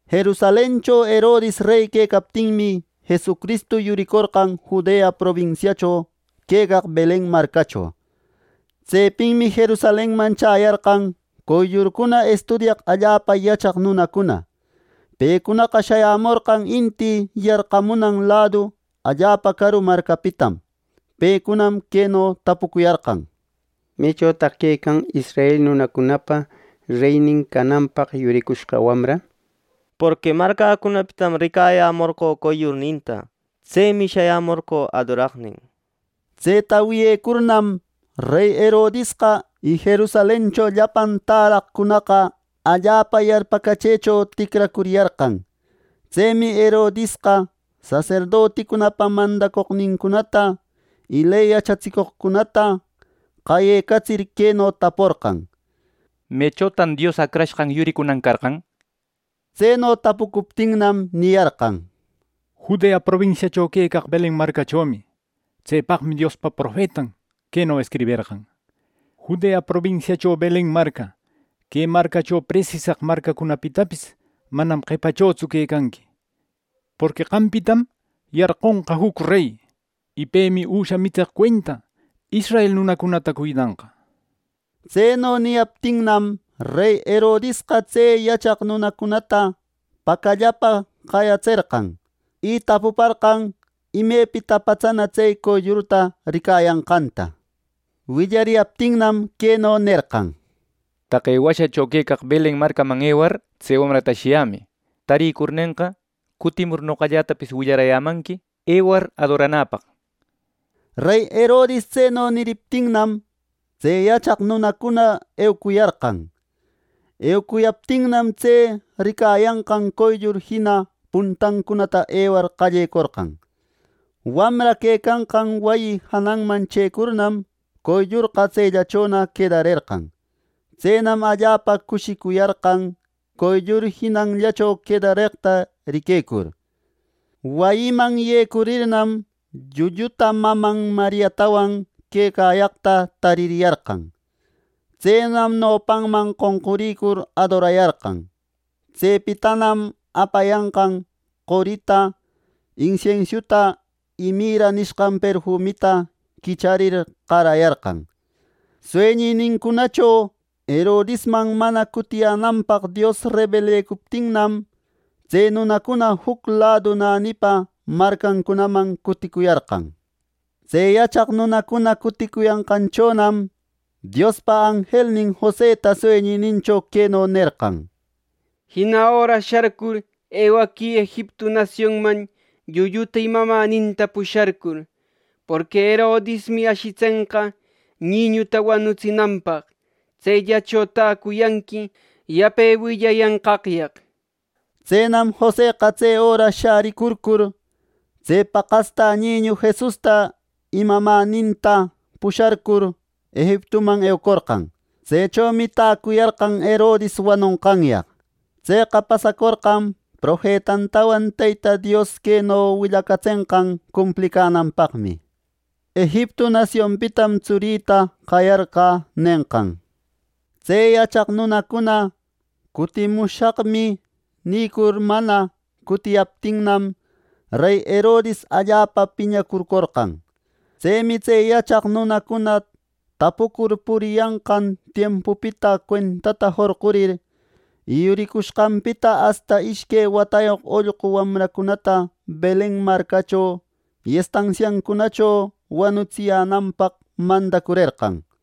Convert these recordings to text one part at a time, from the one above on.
Jerusalencho Herodis rey quecaptinmi, Jesucristu yuricorqan Judea probinsiacho quecaq Belen marcacho. Tsepinmi Jerusalenman chäyarqan qoyllurcuna estudiyaq allapa yachaq nunacuna. Pecunaqa shayämorqan inti yarqamunan ladu allapa caru marcapitam. Pecunam queno tapucuyarqan: —¿Mechotaq quecan israel nunacunapa reynin cananpaq yuricushqa wamra? Porqui marcäcunapitam ricayämorqö qoyllurninta. Tsemi shayämorqö adoraqnin —nishpa. Tseta wiyecurnam, rey Herodisqa y Jerusalencho llapan täraqcunaqa allapa yarpäcachëcho ticracuriyarqan. Tsemi Herodisqa saserdoticunapa mandacoqnincunata y ley yachatsicoqcunata qayecatsir, queno taporqan: —¿Mechotan Dios Acrashqan yuricunan carqan? —nir. Tseno tapucuptinnam, niyarqan: —Judea probinsiacho quecaq Belen marcachomi. Tsepaqmi Diospa profetan queno escriberqan: ‘Judea probinsiacho Belen marca, que marcacho presisaq marcacunapitapis manam qepachotsu quecanqui; Porqui qampitam yarqunqa juc rey y pemi üsha mitseq cuenta israel nunäcunata cuidanqa’ —nir. Tseno niyaptinnam, rey Herodisqa tse yachaq nunacunata pacallapa qayatserqan, y tapuparqan imepita patsana tse qoyllurta ricayanqanta. Willariyaptinnam, queno nerqan: —Taqe washacho quecaq Belen marcaman ewar tse wamrata ashiyämï. Tarïcurnenqa, cutimur noqallätapis willarayämanqui ewar adoranäpaq —nir. Rey Herodis tseno niriptinnam, tse yachaq nunacuna ewacuyarqan. Ewecayaptinam, tse ricayanqan qoyllur jina puntancunata ewar qallecorqan. Wamra quecanqan wayi jananman chëcurnam, qoyllurqa tsellachona quedarerqan. Tsenam allapa cushiquicuyarqan qoyllur jinallancho quedareqta riquecur. Wayiman yecurirnam, llulluta maman Mariatawan quecayaqta taririyarqan. Tsenam nopanman qonqurïcur adorayarqan. Tsepitanam apayanqan qorita, insiensiuta y mirra nishqan perfumita quicharir qarayarqan. Sueñinincunacho Herodisman mana cutiyänanpaq Dios rebelecuptinnam, tse nunacuna juc ladu nänipa marcancunaman cuticuyarqan. Tse yachaq nunacuna cuticuyanqanchonam, Diospa anjelnin Joseta sueñinincho queno nerqan: —¡Jina öra sharcur, ewaquï Egiptu nasionman llulluta y mamäninta pusharcur; porqui Herodismi ashitsenqa niñuta wanutsinanpaq. Tsellacho täcuyanqui yape willayanqaqyaq! —nir. Tsenam Joseqa tse öra shäricurcur, tse paqastä niñu Jesusta y mamäntinta pusharcur, Egiptuman ewacorqan. Tsechomi täcuyarqan Herodis wanonqanyaq. Tseqa pasacorqan profetantawan Teyta Dios queno willacatsenqan cumplicänanpaqmi: “Egiptu nasionpitam Tsurïta qayarqä” nenqan. Tse yachaq nunacuna “Cutimushaqmi” nicur mana cutiyaptinnam, rey Herodis allapa piñacurcurcorqan. Tsemi tse yachaq nunacuna tapucur puriyanqan tiempupita cuentata jorqurir, yuricuyashqanpita asta ishque watayoq ollqu wamracunata Belen marcacho y estansiancunacho wanutsiyänanpaq mandacurerqan.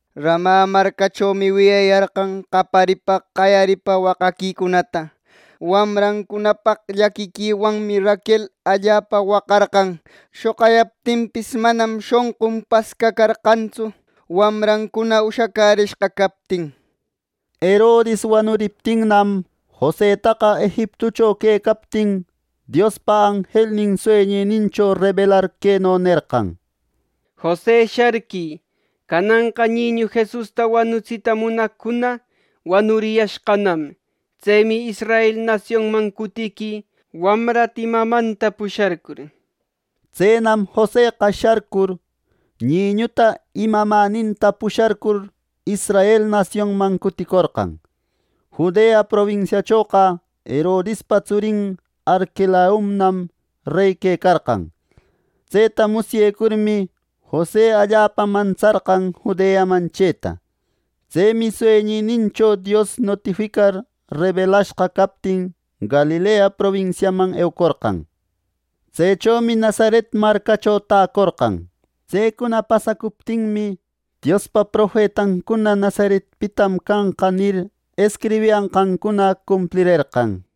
“Rama marcachomi wiyayarqan qaparipa, qayaripa waqaquicunata. Wamrancunapaq llaquiquiwanmi Raquel allapa waqarqan. Shoqayaptinpis, manam shonqun pascacärerqantsu, wamrancuna ushacärishqa captin” nir. Herodis wanuriptinnam, Josetaqa Egiptucho quecaptin Diospa anjelnin sueñinincho rebelar queno nerqan: —¡Jose, sharquï! Cananqa Niñu Jesusta wanutsita munaqcuna wanuriyashqanam. Tsemi Israel nasionman cutiquï, wamrata y mamanta pusharcur —nir. Tsenam Joseqa sharcur, Niñuta y mamäninta pusharcur, Israel nasionman cuticorqan. Judea probinsiachoqa Herodispa tsurin Arquelaunam rey quecarqan. Tseta musyecurmi, Jose allapa mantsarqan Judeaman chëta. Tsemi sueñinincho Dios notificar rebelashqa captin Galilea probinsiaman eucorqan. Tsechomi Nazaret marcacho täcorqan. Tsecuna pasacuptinmi, Diospa profetancuna “Nazaretpitam canqa” nir, escribiyanqancuna cumplirerqan.